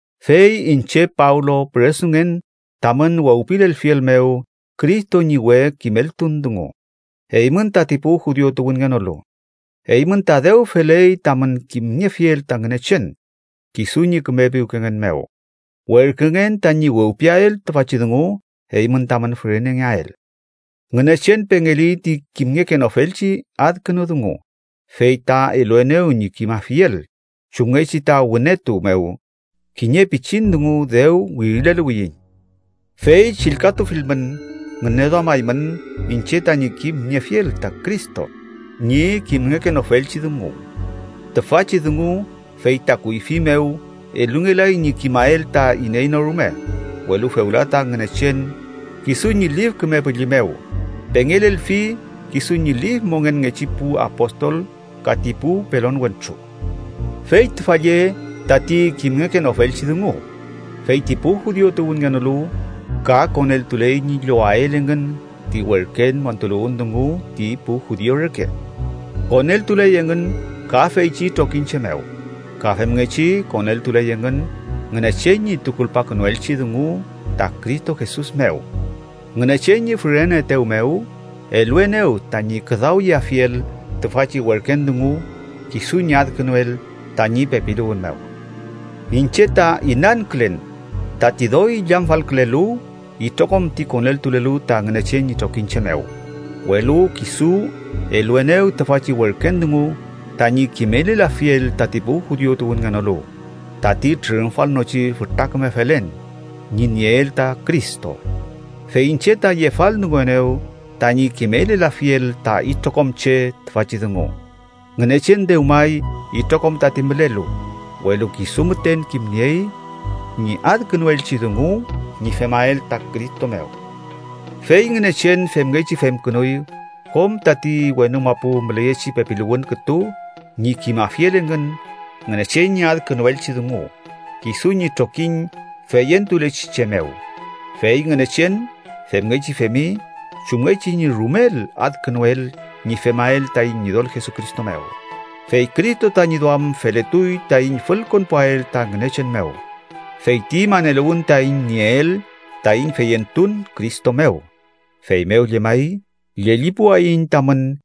Fey iñche Pablo püresungen tamün wewpilelfiel mew Cristo ñi we kimeltun dungu, eymün tati pu judiu tuwünngenolu. Eymün ta dew feley tamün kimniefiel ta Ngünechen, kisu ñi küme piwkengen mew, werküngen tañi wewpiael tüfachi dungu eymün tamün fürenengeael. Ngünechen pengeli ti kimngekenofelchi adkünu dungu, fey ta eluenew ñi kimafiel, chumngechi ta wünetu mew kiñe pichin dungu dew wirileluwiyiñ. Fey chillkatufilmün, ngüneduamaymün iñche tañi kimniefiel ta Cristo ñi kimngekenofelchi dungu. Tüfachi dungu, fey ta kuyfi mew elungelay ñi kimael ta iney no rume, welu fewla ta Ngünechen kisu ñi Lif Küme Püllü mew pengelelfi kisu ñi lif mongenngechi pu apostol ka ti pu pelon wentru. Fey tüfa lle tati kimngekenofelchi dungu: feyti pu judiu tuwünngenolu ka koneltuley ñi llowael engün ti werken montuluwün dungu ti pu judiu reke. Koneltuley engün ka feychi trokiñche mew, ka femngechi koneltuley engün Ngünechen ñi tukulpakünuelchi dungu ta Cristo Jesus mew. Ngünechen ñi füreneetew mew, eluenew tañi küdawyeafiel tüfachi werken dungu, kisu ñi adkünuel tañi pepiluwün mew. Iñche ta inankülen tati doy illamfalkülelu itrokom ti koneltulelu ta Ngünechen ñi trokiñche mew, welu kisu eluenew tüfachi werken dungu tañi kimelelafiel tati pu judiu tuwünngenolu tati trürümfalnochi fütra küme felen ñi nieel ta Cristo. Fey iñche ta yefaldunguenew tañi kimelelafiel ta itrokom che tüfachi dungu. Ngünechen dewmay itrokom tati mülelu, welu kisu müten kimniey ñi adkünuelchi dungu ñi femael ta Cristo mew. Fey Ngünechen femngechi femkünuy kom tati wenu mapu müleyechi pepiluwün kütu ñi kimafiel engün Ngünechen ñi adkünuelchi dungu kisu ñi trokiñ feyentulechi che mew. Fey Ngünechen femngechi femi chumngechi ñi rumel adkünuel ñi femael taiñ Ñidol Jesucristo mew. Fey Cristo tañi duam feletuy taiñ fülkonpuael ta Ngünechen mew, feyti maneluwün taiñ nieel taiñ feyentun Cristo mew. Feymew llemay, llellipuwayiñ tamün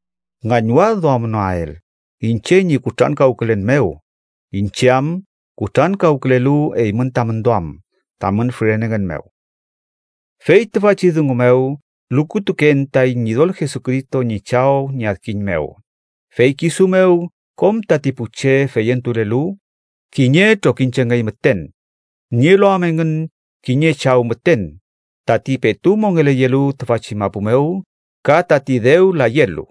ngañwadduamnoael iñche ñi kutrankawkülen mew, iñche am kutrankawkülelu eymün tamün duam, tamün fürenengen mew. Fey tüfachi dungu mew lukutuken taiñ Ñidol Jesucristo ñi Chaw ñi adkiñ mew. Fey kisu mew kom tati pu che feyentulelu, kiñe trokiñchengey müten, nielu am engün kiñe Chaw müten, tati petu mongeleyelu tüfachi mapu mew ka tati dew layelu.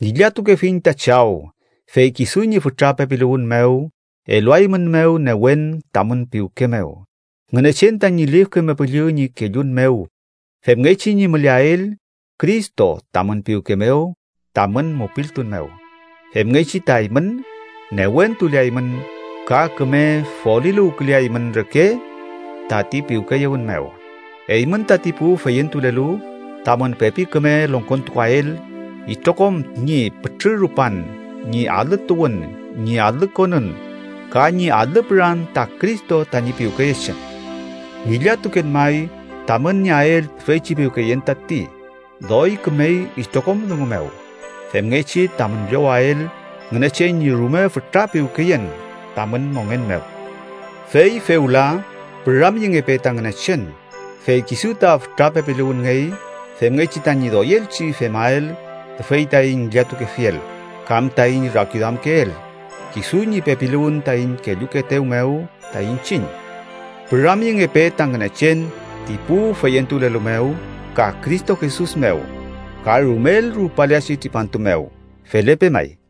Ngillatukefiñ ta Chaw, fey kisu ñi fütra pepiluwün mew eluaeymünmew newen tamün piwke mew, Ngünechen tañi Lif Küme Püllü ñi kellun mew, femngechi ñi müleael Cristo tamün piwke mew tamün mupiltun mew. Femngechi ta eymün, newentuleaymün ka küme foliluwküleaymün reke tati piwkeyewün mew, eymün tati pu feyentulelu tamün pepi küme longkontukuael itrokom ñi pütrü rupan, ñi alü tuwün, ñi alü konün ka ñi alü püran ta Cristo tañi piwkeyechen. Ngillatuken may, tamün nieael tüfeychi piwkeyen, tati doy kümey itrokom dungu mew, femngechi tamün llowael Ngünechen ñi rume fütra piwkeyen tamün mongen mew. Fey fewla, püramyengepe ta Ngünechen. Fey kisu ta fütra pepiluwünngey femngechi tañi doyelchi femael tüfey taiñ ngillatukefiel kam taiñ rakiduamkeel, kisu ñi pepiluwün taiñ kellukeetew mew ta iñchiñ. ¡Püramyengepe ta Ngünechen ti pu feyentulelu mew ka Cristo Jesus mew, ka rumel rupaleachi tripantu mew! Felepe may.